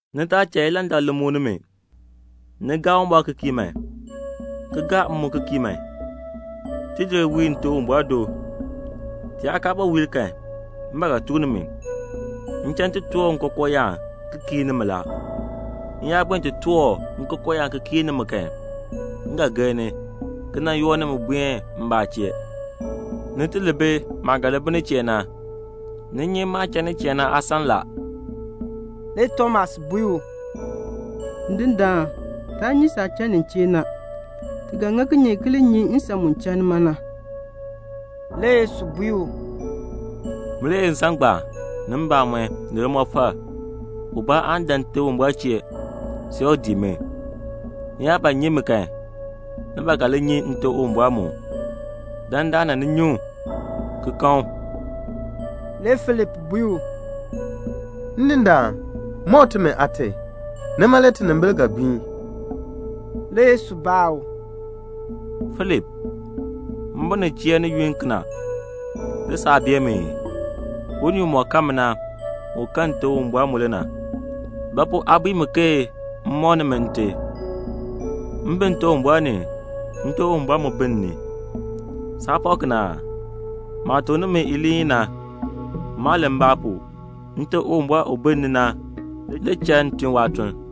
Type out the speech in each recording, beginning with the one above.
"Ni taa cha ilandak li muk nimi. Ni gaa Uwumbɔr ki kii man, ki gaa m mu ki kii man. Tidir wiir Nte Uwumbɔr do. Ti yaa kaa ba wiir kan, m ba ga tuk nimi. M cha m ti toor nkookooyaan ki kiir nimi la. M yaa buen ti toor nkookooyaan ki kiir nimi kan, m ga gir ni, ki nan yoor nimi buen mbaa chee, ni ti li bi maah ga li bi nin chee na. Ni nyi maah cha nin chee na aasan la." Le Tomas bui u, "Ndindaan, taa nyi saah cha nin chee na. Ti ga ŋa kinye le ki li nyi nsan mu cha nima na?" Le Yesu bui u, "Min le ye nsan ngbaan, ni mbamɔn, ni limɔfal. Ubaa aan dan Nte Uwumbɔr chee, see u dii mi. Ni yaa ba nyi mi kan, ni ba ga li nyi Nte Uwumbɔr mu. Dandana ni nyi u, ki kan u." Le Filip bui u, "Ndindaan, mɔk timi Aate. Nima le tinimbil ga gbiin." Le Yesu baa u, "Filip, m bi ni chee ni yunn kena, le saa bee mi ii? Unii umɔk kan mi na, u kan Nte Uwumbɔr mu le na. Ba pu aa bui mi ke m mɔk nimi Nte? M bi Nte Uwumbɔr ni, Nte Uwumbɔr mu bi m ni. Saa pak kena aa? Maah tuk nimi iliin i na, maa len mbaa pu. Nte Uwumbɔr u bi m ni na le cha m tun waatuln.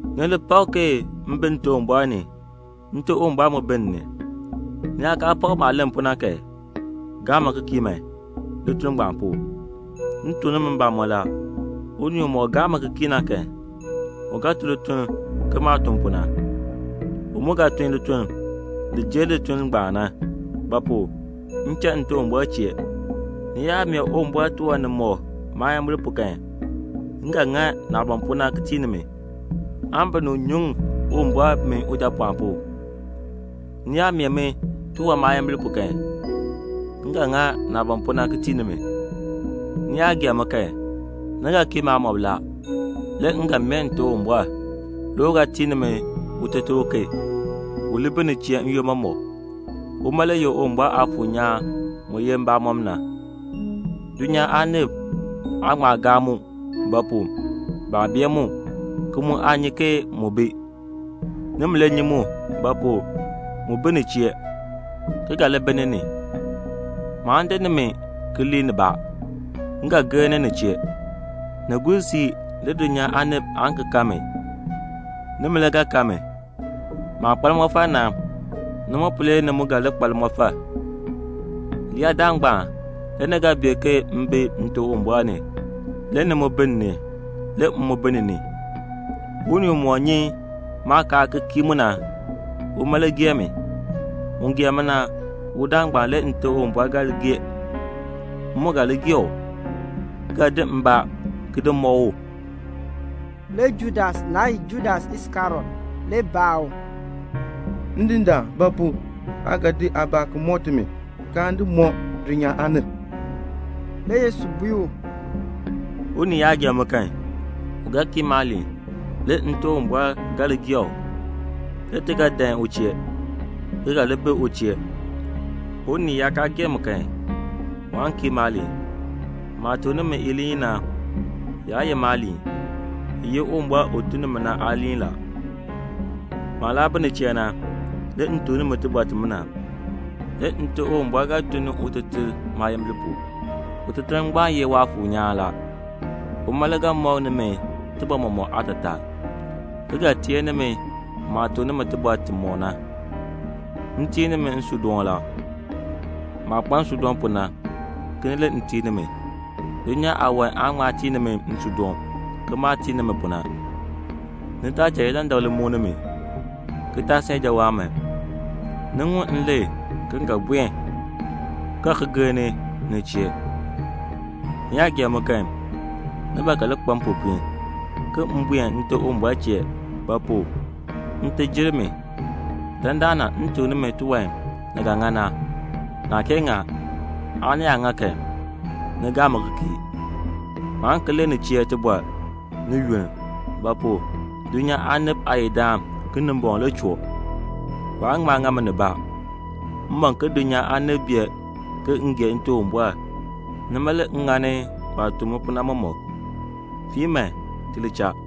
"Ni li pak ke m bi Nte Uwumbɔr ni, Nte Uwumbɔr mu bi m ni. Ni yaa kaa pak maah len pu na kan, gaa mi ki kii man lituln ngbaan pu. M tuk nimi mbamɔn la, unii umɔk gaa mi ki kii na kan, u ga tun lituln ke maah tun pu na. U mu ga tun lituln li jer lituln ngbaan na; ba pu? m cha Nte Uwumbɔr chee. Ni yaa mee Uwumbɔr tiwan nimɔk maayimbil pu kan, m ga ŋa naah ban pu na ki tii nimi, aan binib nyuŋ Uwumbɔr min Ujapɔɔn pu. Ni yaa mee mi tiwan maayimbil pu kan, m ga ŋa naah ban pu na, ki tii nimi." "Ni yaa gee mi kan, ni ga kii maamɔb la, le m ga mee Nte Uwumbɔr, le u ga tii nimi Uteter uken, u li bi ni chee n-yoonn mɔmɔk. Uma le ye Uwumbɔr Aafuur nyaan mu ye mbamɔn na. Dulnyaa aanib aa ŋma gaa mu; ba pu? baa bee mu, ki mu aa nyi ke mu bi. Nimi le nyi mu; ba pu? mu bi ni chee, ki ga li bi ni ni. "Maan di nimi ki lii nibaa. M ga gir ni ni chee. Ni gur siib le dulnyaa aanib aan ki kan mi. Nimi le ga kan mi. Maah kpa limɔfal na, nima pu le ni mu ga li kpa limɔfal. Leyaadaal ngbaan le ni ga bee ke m bi Nte Uwumbɔr ni, le ni mu bi m ni, le m mu bi ni ni. "Unii umɔk nyi maakaal ki kii mu na, uma le gee mi. Un gee mi na, udaan ngbaan le Nte Uwumbɔr ga li gee. M mu ga li gee u, ki ga di mbaa ki di mɔk u." Le Judas, naa ye Judas Iskariot, le baa u, "Ndindaan, ba pu aa ga di aabaa ki mɔk timi, kaan di mɔk dulnyaa aanib?" Le Yesu bui u, "Unii yaa gee mi kan, u ga kii maaliin, le Nte Uwumbɔr ga li gee u, le ti ga dan u chee, ki ga li bi u chee. Unii yaa kaa gee mi kan, waan kii maaliin. Maah tuk nimi iliin i na, yaa ye maaliin, i ye Uwumbɔr u tun ni mi na aaliin la. "Maah laa bi ni chee na, le m tuk nimi tibɔr timina. Le Nte Uwumbɔr ga tun ni Uteter maayimbil pu. Uteter ngbaan ye Waafuur nyaan la. Uma le ga mɔk nimi tibɔr mɔmɔk aatataa, ki ga teer nimi maah tuk nimi tibɔr timɔk na. "M tii nimi nsuudoon la. Maah kpa nsuudoon pu na, kena le m tii nimi. Dulnyaa aawan aa ŋma tii nimi nsuudoon ke maah tii nimi pu na. Ni taa cha ilandak li muk nimi, ki taa san ijawaan man. Ni ŋun m len ke m ga buen ki ga ki gir ni, ni chee. Ni yaa gee mi kan, ni ba ga li kpa mpopiin, ke m buen Nte Uwumbɔr chee; ba pu? Nte jer mi. Dandana m tuk nimi tiwan ni ga ŋa na, naa kee ŋa, aan ni yaa ŋa kan, ni gaa mi ki kii. Maan ki len ni chee tibɔr ni yunn; ba pu? dulnyaa aanib aayidaan Kinimbɔŋ le choo. Waan ŋma ŋa mi nibaa. M ban ke dulnyaa aanib bee ke m gee Nte Uwumbɔr, nima le m ŋani waah tuk mi pu na mɔmɔk. "Fiin man, ti li cha."